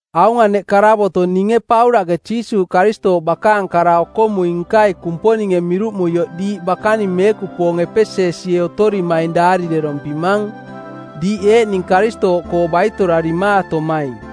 Aung aneꞌ karavoto˜ ninge Paulaꞌke Jiisuuꞌ Karistooꞌ bakaang kara-okomui-nkai Kumponinge miruꞌmuioꞌ diiꞌ bakaning meekupoong Epesesie otorimaing daarirerompimang, diiꞌ eeꞌning Karistooꞌkoo baitorarimaatomaing.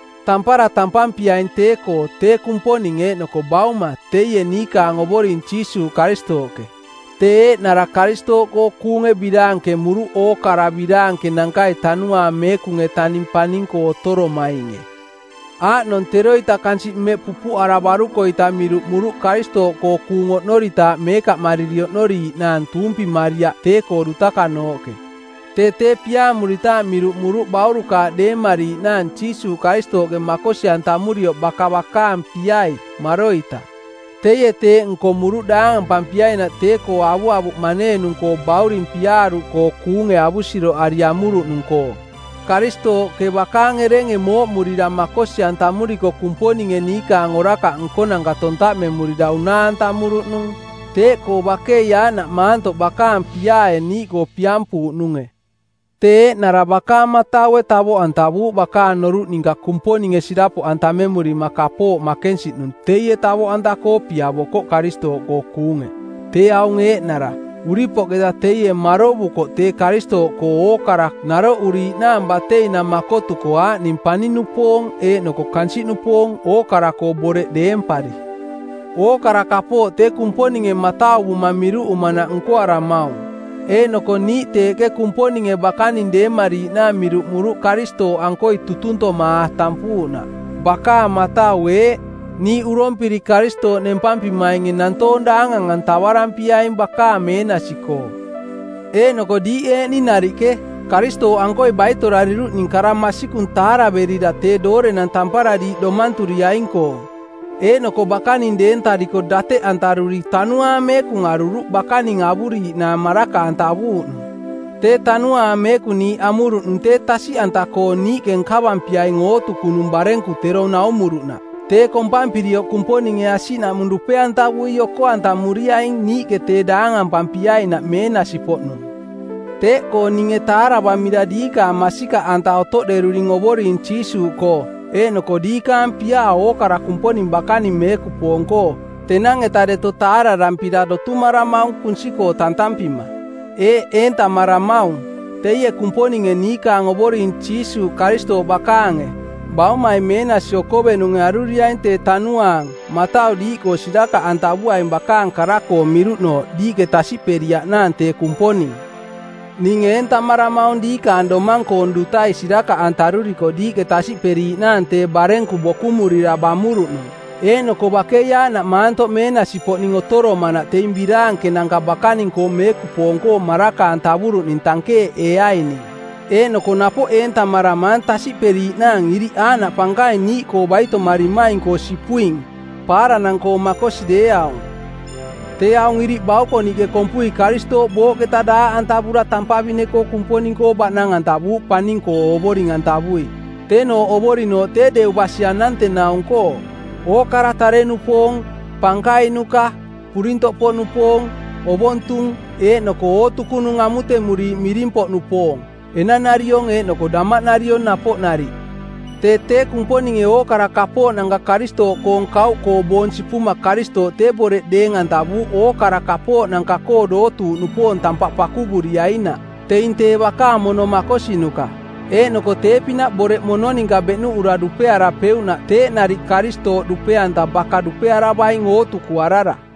Tampara tampampiaing tee-koo tee Kumponing eeꞌnoko Bauma teie niikaang Ovoring Jiisuuꞌ Karistooꞌke, tee eeꞌnara Karistooꞌkoo kuunge biraankemuruꞌ ookara biraankenankai Tanuaang Meekung-etaning paning-koo otoromainge. Aaꞌnong teroita kansiꞌ mmeꞌ pupuꞌaravaruko-ita miruꞌmuruꞌ Karistooꞌkoo kuung oꞌnoritaaꞌ meekaꞌmariri oꞌnoriiꞌnaang tuumpimariaꞌ tee-koo dutakanooꞌke. Tee tee piaamuritaaꞌ miruꞌmuruꞌ baurukaaꞌ deemariiꞌnaang Jiisuuꞌ Karistooꞌke makosi-antamurioꞌ baka bakaang piai, maroita. Teie teeꞌ nkomuruꞌ daangampampiainaꞌ tee-koo avuavuꞌ maneenung-koo Bauring Piaaruꞌkoo kuunge avusiroꞌari amuruꞌnung-koo. Karistooꞌke bakaang erenge mooꞌmurira makosi-antamuriko Kumponinge niikaang orakaꞌ nkonanka tontaꞌmemurira unaa-antamuruꞌnung; Teeꞌkoo bakei aaꞌnaꞌ maantoꞌ bakaang piaae niiꞌkoo piampuuꞌnunge, tee eeꞌnara bakaang mataue tavoꞌantavuuꞌ bakaang noruꞌ ninka Kumponinge sirapoꞌantamemurima kapooꞌ makensiꞌnung teie tavoꞌanta-koo piavokoꞌ Karistooꞌkoo kuunge. Tee aung eeꞌnara: Uripoꞌketa teie marovukoꞌ tee Karistooꞌkoo ookara naroꞌuriiꞌnaang bateinang makotuko aaꞌning paning-nupoong eeꞌnoko kansiꞌnupoong, ookara-koo boreꞌ deempari. Ookara kapooꞌ tee Kumponinge matauvuma miruꞌumanaꞌ nkoaramaung, eeꞌnoko niiꞌ teeꞌke Kumponinge bakaning deemariiꞌnaang miruꞌmuruꞌ Karistooꞌankoi tutuntomaa tampuuꞌnaꞌ. Bakaang matau eeꞌ: Niiꞌ urompiri Karistooꞌ nempampimainge nantoong daangang-antavarampiaing bakaang meenasi-koo. Eeꞌnoko diiꞌ eeꞌning nariꞌke, Karistooꞌankoi baitorariruꞌning kara masikung taaraverira tee doorenang tampara diiꞌ domanturiaing-koong. Eeꞌnoko bakaning deentariko dateꞌantaruri Tanuaang Meekung aruruꞌ bakaning avuriiꞌnaang maraka-antavuuꞌnung. Tee Tanuaang Meekung niiꞌ amuruꞌnung tee tasiꞌanta-koo niiꞌke nkavampiaing ootukunung barenku tero naumuruꞌnaꞌ. Tee kompampirioꞌ Kumponinge asiꞌnaꞌmung dupe-antavui oko-antamuriaing, niiꞌke tee daangampampiainaꞌ meenasi-poꞌnung. Teeꞌkoo ninge taaravamira diiꞌ masikaꞌanta otoꞌderuring Ovoring Jiisuuꞌkoo eeꞌnoko diikaang piaa ookara Kumponing bakaning meekupoong-koo, tenang-eta deto taararampira dotumaramaung kunsi-koo tantampima. Eeꞌ eentamaramaung: Teie Kumponinge niikaang Ovoring Jiisuuꞌ Karistooꞌ bakaange, Baumai Meenasi Okovenunge aruriaing tee Tanuaang matau diiꞌkoo sirakaꞌantavuaing bakaang kara-koo miruꞌnooꞌ diiꞌke tasiꞌperiaꞌnaang tee Kumponing. Ning eentamaramaung diikaang domang-koong dutai sirakaꞌantaruriko diiꞌke tasiꞌperiiꞌnaang tee barenku bokumurira bamuruꞌnung, eeꞌnoko bakei aaꞌnaꞌ maantoꞌ meenasi-poꞌning otoromanaꞌ teing biraankenanka bakaning-koo meekupoong-koo maraka-antavuruꞌning tankeeꞌeeaining. Eeꞌnoko napoꞌ eentamaramaang tasiꞌperiiꞌnaang iriꞌ aaꞌnaꞌ pankaing niiꞌkoo baitomarimaing-koo sipuing, paaranang-koo makosi deeaung. Tee aaꞌnung iriꞌ baukoniꞌke kompui Karistooꞌ booꞌketa daaꞌantavura tampavine-koo Kumponing-koo baꞌnang-antavuuꞌ paning-koo Ovoring-antavui. Teenooꞌ Ovorinooꞌ tee deu basi anantenaung-koo: ookara tare-nupoong, pankainuka, purintoꞌpoꞌnupoong, ovontung eeꞌnoko ootukunung amutemuriiꞌ miring-poꞌnupoong, enanariong eeꞌnoko damaꞌnariong napoꞌ nariꞌ. Tee tee Kumponinge ookara kapooꞌnanka Karistooꞌkoong kauꞌkoo boong sipuma Karistooꞌ tee boreꞌ deeng-antavuuꞌ ookara kapooꞌnanka-koo dootuuꞌnupoong tampaꞌ pakuvuriainaꞌ, teing tee bakaang mono makosinuka. Eeꞌnoko tee-pinaꞌ boreꞌ mono ninka beꞌnuꞌura dupearapeuꞌnaꞌ teeꞌ nariꞌ Karistooꞌ dupe-anta baka dupearavaing ootukuarara.